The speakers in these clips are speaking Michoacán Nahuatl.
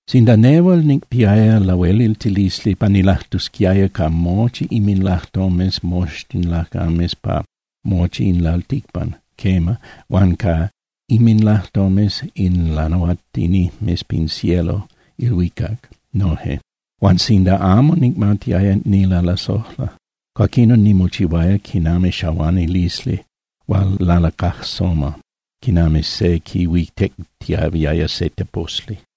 Sinda nehual nicpiaya lahueliltilisli pa nilajtusquiaya ca mochi inminlajtomes moxtin lacames pa mochi in lalticpan, quema, huan ca inminlajtomes in lanahuatinijmes pin cielo (ilhuicac) noje, huan sinda amo nicmatiaya nilalasojla, cuaquinon nimochihuaya quinami xahuanilisli hual lalacajsoma, quinami se quihuitectiahuiaya se teposli.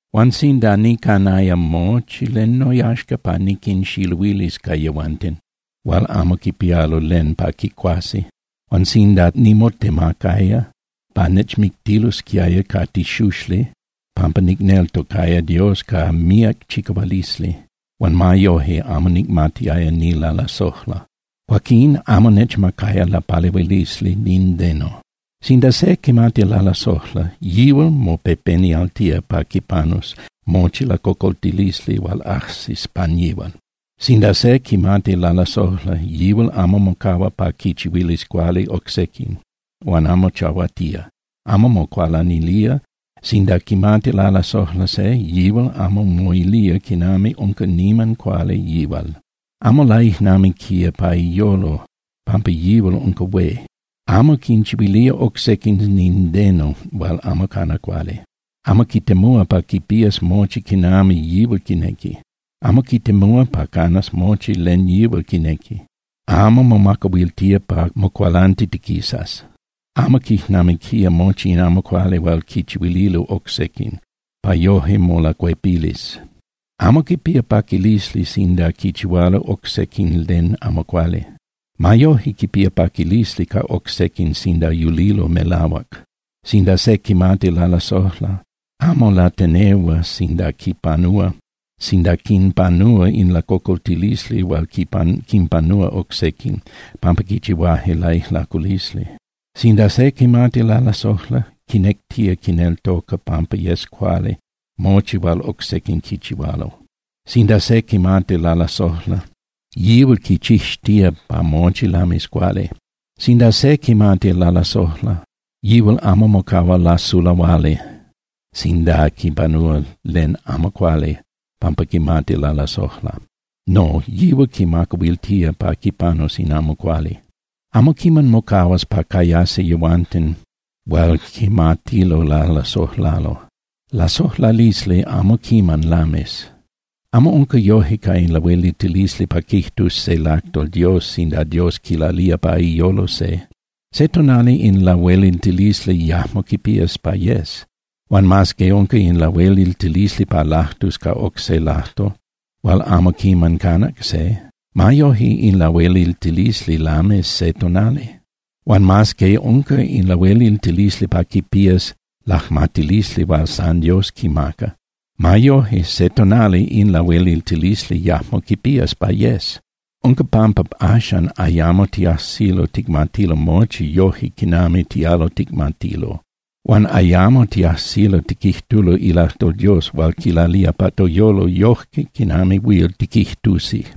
Huan sinda nicanaya mochi len noyaxca pa niquinxiluilis ca yehuanten hual amo quipialo len pa quicuasi, huan sinda nimotemacaya pa nechmictilosquiaya ca tixuxli pampa nicneltocaya Dios ca míac chicahualisli, huan ma yoje amo nicmatiaya nilalasojla, cuaquín amo nechmacaya lapalehuilisli nindeno. Sinda se quimati lalasojla, yihual mopepenialtía pa quipanus mochi lacocoltilisli hual ajsis pan yihual. Sinda se quimati lalasojla, yihual amo mocahua pa quichihuilis cuali oc sequin, huan amo chahuatía, amo mocualanilía. Sinda quimati lalasojla se, yihual amo moilía quinami unca niman cuali yihual. Amo laijnamiquía pa iyolo pampa yihual unca hué. Amo quinchihuilía oc sequin nindeno hual amo cana cuali. Amo quitemúa pa quipías mochi quinami yihual quinequi. Amo quitemúa pa canas mochi len yihual quinequi. Amo momacahuiltía pa mocualantitiquisas. Amo quijnamiquía mochi in amo cuali hual quichihuililo oc sequin, pa yoje molacuepilis. Amo quipía paquilisli sinda quichihualo oc sequin len amo cuali. Ma yoje, quipía paquilisli ca oc sequin sinda yulilo melahuac. Sinda se quimati lalasojla, amo latenehua sinda quinpanúa in lacocoltilisli hual quinpanúa oc sequin pampa quichihuaje laijlaculisli. Sinda se quimati lalasojla, quinectía quineltoca pampa yes cuali mochi hual oc sequin quichihualo. Sinda se quimati lalasojla, yihual quichixtía pa mochi lamis cuali. Sinda se quimati lalasojla, yihual amo mocahua lasulahuali sinda quipanúa len amo cuali pampa quimati lalasojla. No, yihual quimacahuiltía pa quipanus in amo cuali. Amo quiman mocahuas pa cayasi yehuanten hual quimatilo lalasojlalo, lasojlalisli amo quiman lamis. Amo unca yoje ca in lahueliltilisli pa quijtus se ilajtol Dios sinda Dios quilalía pa iyolo se. Se tonali in lahueliltilisli yajmo quipías pa yes. Huan mas que unca in lahueliltilisli pa lajtus ca oc se lajtol hual amo quiman canac se, ma yoje in lahueliltilisli lamis se tonali. Huan mas que unca in lahueliltilisli pa quipías lajmatilisli hual san Dios quimaca, ma yoje, se tonali in lahueliltilisli yajmo quipías pa yes. Unca pampa axan ayamo tiajsilo ticmatilo mochi yoje quinami tialo ticmatilo, huan ayamo tiajsilo tiquijtulo ilajtol Dios hual quilalía pa toyolo yoje quinami huil tiquijtusi.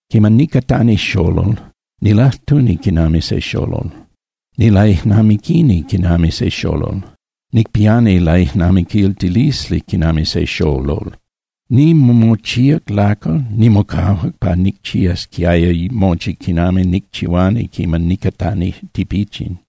Quiman nicatani xolol, nilajtuni quinami se xolol, nilaijnamiquini quinami se xolol, nicpiani laijnamiquiltilisli quinami se xolol. Nimochíac lacal, nimocahuac pa nicchiasquiaya mochi quinami nicchihuani quiman nicatani tipichin.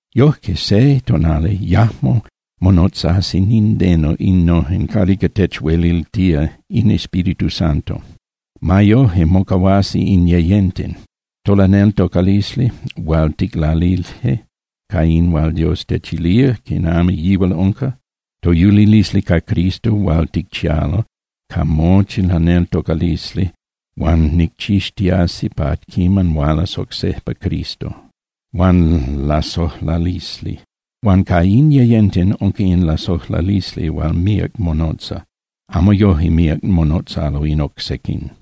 Yoje, se tonali, yajmo monotzasi nindeno innojen calica techueliltía in Espíritu Santo. Ma yoje mocahuasi in yeyenten: Tolaneltocalisli hual ticlalije ca in hual Dios techilía quinami yihual unca, toyulilisli ca Cristo hual ticchialo ca mochi laneltocalisli huan ticchixtiasi pa quiman hualas oc sejpa Cristo, huan lasojlalisli. Huan ca in yeyenten, unca in lasojlalisli hual míac monotza. Amo yoje míac monotzalo in oc sequin.